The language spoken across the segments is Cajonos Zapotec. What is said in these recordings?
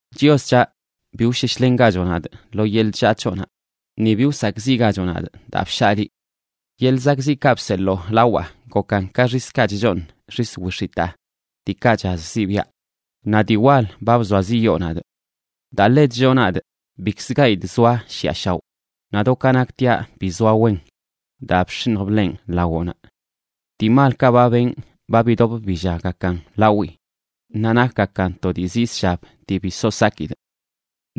Chios c̱haꞌ, bi wsheshlengachoꞌ nadꞌ lo yeḻꞌ chllaa c̱hoꞌnaꞌ ni bi wsakꞌziꞌgachoꞌ nadꞌ daa bshaa liꞌ. Yeḻꞌ zakꞌziꞌkaꞌ bseḻoo lawaꞌ gokan ka xiskaꞌ chchooṉ xis wix̱itaa, diikaꞌ chaz zibiaꞌ; naꞌ dii wal ba bzoaziꞌyoo nadꞌ. Daa ḻe chlloo nadꞌ bikzə gayidꞌ zoaꞌ shiꞌa shaoꞌ, naꞌ do ka naktiaꞌ bi zoa wen daa bx̱iṉj bḻenꞌ lawoꞌnaꞌ. Dii malkaꞌ ba benꞌ ba bidop billaggakan lawii; naꞌ nakgakan to dii zii zshab dii bi so sakidꞌ.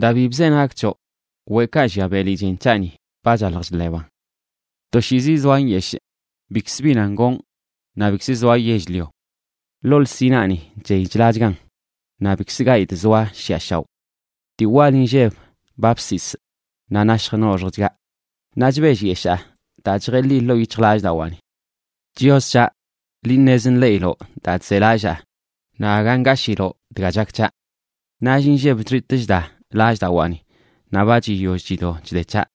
Daa bi bzenagꞌ c̱hoꞌ, weꞌkaꞌ llia beli chen c̱haꞌni ba chaḻj chḻeban. Toshiizi zoaꞌ nyeshꞌ, bikz bi nan gonꞌ naꞌ bikz zoaꞌ yell-lio. Ḻoo lsinaani chey chlachgan, naꞌ bikzə gayidꞌ zoaꞌ shiꞌa shaoꞌ. Dii wal inlleb ba bsisꞌ naꞌ nashj noxjchgaꞌ; naꞌ chbellyeshaa daa chjeḻi ḻoo yic̱hjlallꞌdawaani. Chios c̱haꞌ, liꞌ ṉez nḻeꞌiloꞌ daa chzelallaa, naꞌ aga ngashiloꞌ dga chak c̱haꞌ. Nall inlleb chxitꞌ chda lallꞌdawaani, naꞌ ba chiyoll chido chde c̱haꞌ,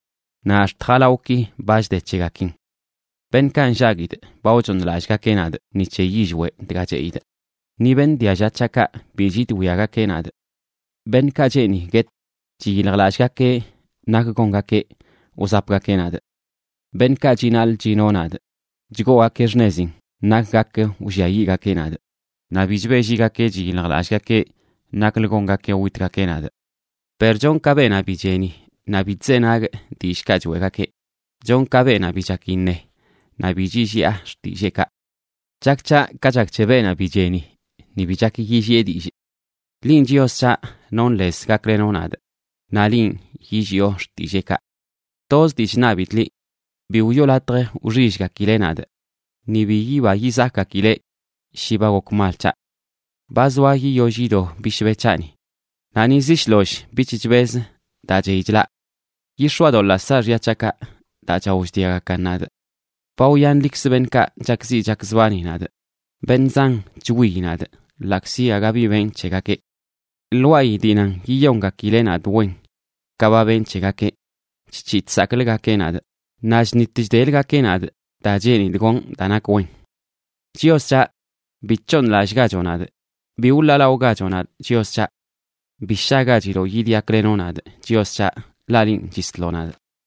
naꞌ ax̱t jalawꞌki ba chde c̱hegakin. Beṉꞌkaꞌ nllaguidꞌ ba wchooṉlallꞌgakeꞌ nadꞌ ni c̱he yillweꞌ dga cheꞌidꞌ; ni beṉꞌ dialla c̱haꞌkaꞌ bi chidwiagakeꞌ nadꞌ. Beṉꞌkaꞌ cheeni guetꞌ chiyiljlallꞌgakeꞌ nak gongakeꞌ wzapgakeꞌ nadꞌ. Beṉꞌkaꞌ chinaḻꞌ chino nadꞌ chgoogakeꞌ xṉezin nak gak wlliayiꞌgakeꞌ nadꞌ, naꞌ bi chbeꞌlligakeꞌ chiyiljlallꞌgakeꞌ naklə gongakeꞌ witgakeꞌ nadꞌ. Per chonꞌ ka beenaꞌ bi cheni naꞌ bi chzenagꞌ dillꞌkaꞌ choeꞌgakeꞌ; chonꞌ ka beenaꞌ bi chak iṉe, naꞌ bi chilliꞌa xtilleekaꞌ. Chak c̱haꞌ ka chak c̱he beenaꞌ bi cheni, ni bi chak yilliꞌe dillꞌ. Linꞌ, Chios c̱haꞌ, nonꞌ lez gaklenoꞌ nadꞌ, naꞌ linꞌ, yilliꞌo xtilleekaꞌ. Toz dii chṉabidꞌ liꞌ: “Bi wiꞌo latj wxillgakileꞌ nadꞌ, ni bi yiba yizakgakileꞌ shi ba gok mal c̱haꞌ.” Ba zoa yiyoll yido bishbe c̱haꞌni, naꞌ ni ziꞌ shloll bich chbez daa chey chlaꞌ. Yix̱oadoḻaa saaxya c̱haꞌkaꞌ, daa chao chdiagakan nadꞌ. Ba wyanlikzə beṉꞌkaꞌ chakziꞌ chakzbani nadꞌ. Beṉꞌ zan chwiyi nadꞌ ḻaꞌkzi aga bi benꞌ c̱hegakeꞌ. Lwaayi dii nan yiyongakileꞌ nadꞌ wen ka ba benꞌ c̱hegakeꞌ, chc̱hiꞌ chsakꞌləgakeꞌ nadꞌ, naꞌ chṉit chdeləgakeꞌ nadꞌ daa cheenidꞌ gonꞌ daa nak wen. Chios c̱haꞌ, bi c̱hooṉlallꞌgachoꞌ nadꞌ. Bi wḻaalaꞌogachoꞌ nadꞌ, Chios c̱haꞌ. Bi shagachiloꞌ yidyaklenoꞌ nadꞌ, Chios c̱haꞌ, ḻaꞌ linꞌ chisloꞌ nadꞌ.